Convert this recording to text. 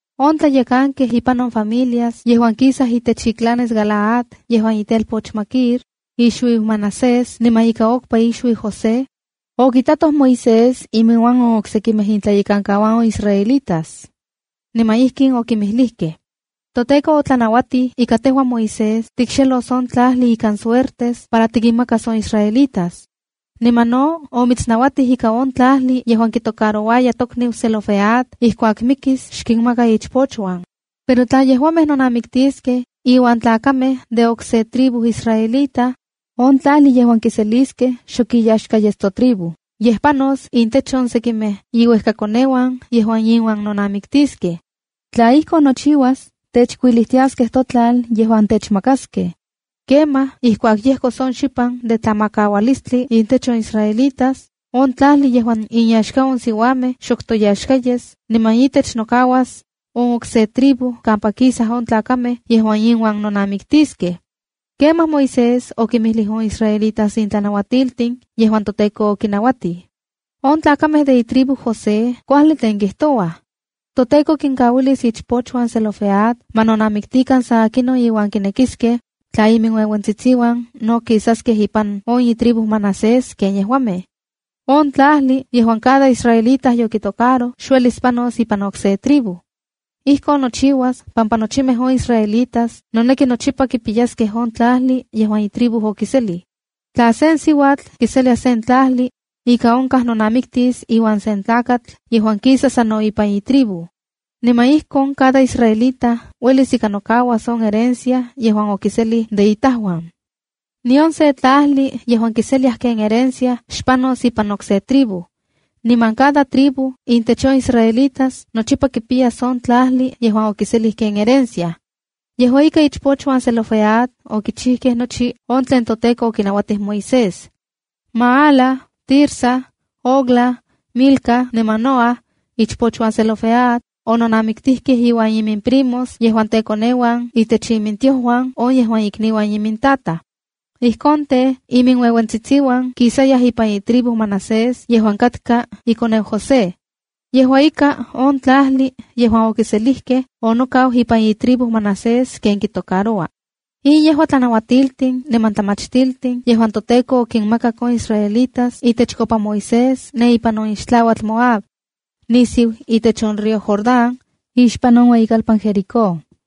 On tlayekankej ipan on familias yejuan kisaj itech iclanes Galaad yejuan itelpoch Maquir, ixuiu Manasés niman ika okpa ixuiu José, okitatoj Moisés iminuan on oksekimej intlayekankauan on israelitas. Niman ijkin okinmijlijkej: —ToTEKO otlanauatij ika tejua Moisés tikxelos on tlajli ikan suertes para tikinmakas on israelitas. Niman no omitsnauatij ika on tlajli yejuan kitocarouaya tokniu Zelofehad ijkuak mikis xkinmaka ichpochuan. Pero tla yejuamej nonamiktiskej iuan tlakamej de okse tribu israelita, on tlajli yejuan kiseliskej, xok iyaxka yes totribu, yej panos intech on sekimej iuejkakoneuan yejuan inuan nonamiktiskej. Tla ijkon nochiuas, techkuilijtiaskej totlal yejuan techmakaskej. Kemaj ijkuak yejkos on xipan de tlamakaualistli intech on israelitas, on tlajli yejuan inyaxka on siuamej xok toyaxka yes, niman itech nokauas on okse tribu kampa kisaj on tlakamej yejuan inuan nonamiktiskej. Kemaj Moisés okinmijlij on israelitas in tlanauatiltin yejuan toTEKO okinauatij: —On tlakamej de itribu José kuajli tlen kijtouaj. ToTEKO kinkauilis ichpochuan Zelofehad ma nonamiktikan san akinon iuan kinekiskej, tla iminueuentsitsiuan no kisaskej ipan on itribu Manasés ken yejuamej. On tlajli yejuan cada israelita yokitocaroj xuelis panos ipan okse tribu. Ijkon nochiuas pampa nochimej on israelitas noneki nochipa kipiyaskej on tlajli yejuan itribu okiselij. Tla sen siuatl kiselia sen tlajli, ika onkaj nonamiktis iuan sen tlakatl yejuan kisa sa no ipan itribu. Niman ijkon cada israelita uelis ika nokauas on herencia yejuan okiselij de itajuan. Nion se tlajli yejuan kiseliaj ken herencia xpanos ipan okse tribu. Niman cada tribu intech on israelitas nochipa kipiyas on tlajli yejuan okiselij ken herencia. Yejua ika, ichpochuan Zelofehad okichijkej nochi on tlen toTEKO okinauatij Moisés. Maala, Tirsa, Hogla, Milca niman Noa, ichpochuan Zelofehad, ononamiktijkej iuan imimprimos yejuan tekoneuan itech imintiojuan on yejuan ikniuan imintataj. Ijkon tej, iminueuentsitsiuan kisayaj ipan itribu Manasés yejuan katka ikoneu José. Yejua ika, on tlajli yejuan okiselijkej onokau ipan itribu Manasés ken kitocaroua. In yejua tlanauatiltin niman tlamachtiltin yejuan toTEKO okinmakak on israelitas itechkopa Moisés ne ipan on ixtlauatl Moab, nisiu itech on río Jordán, ixpan on ueyikalpan Jericó.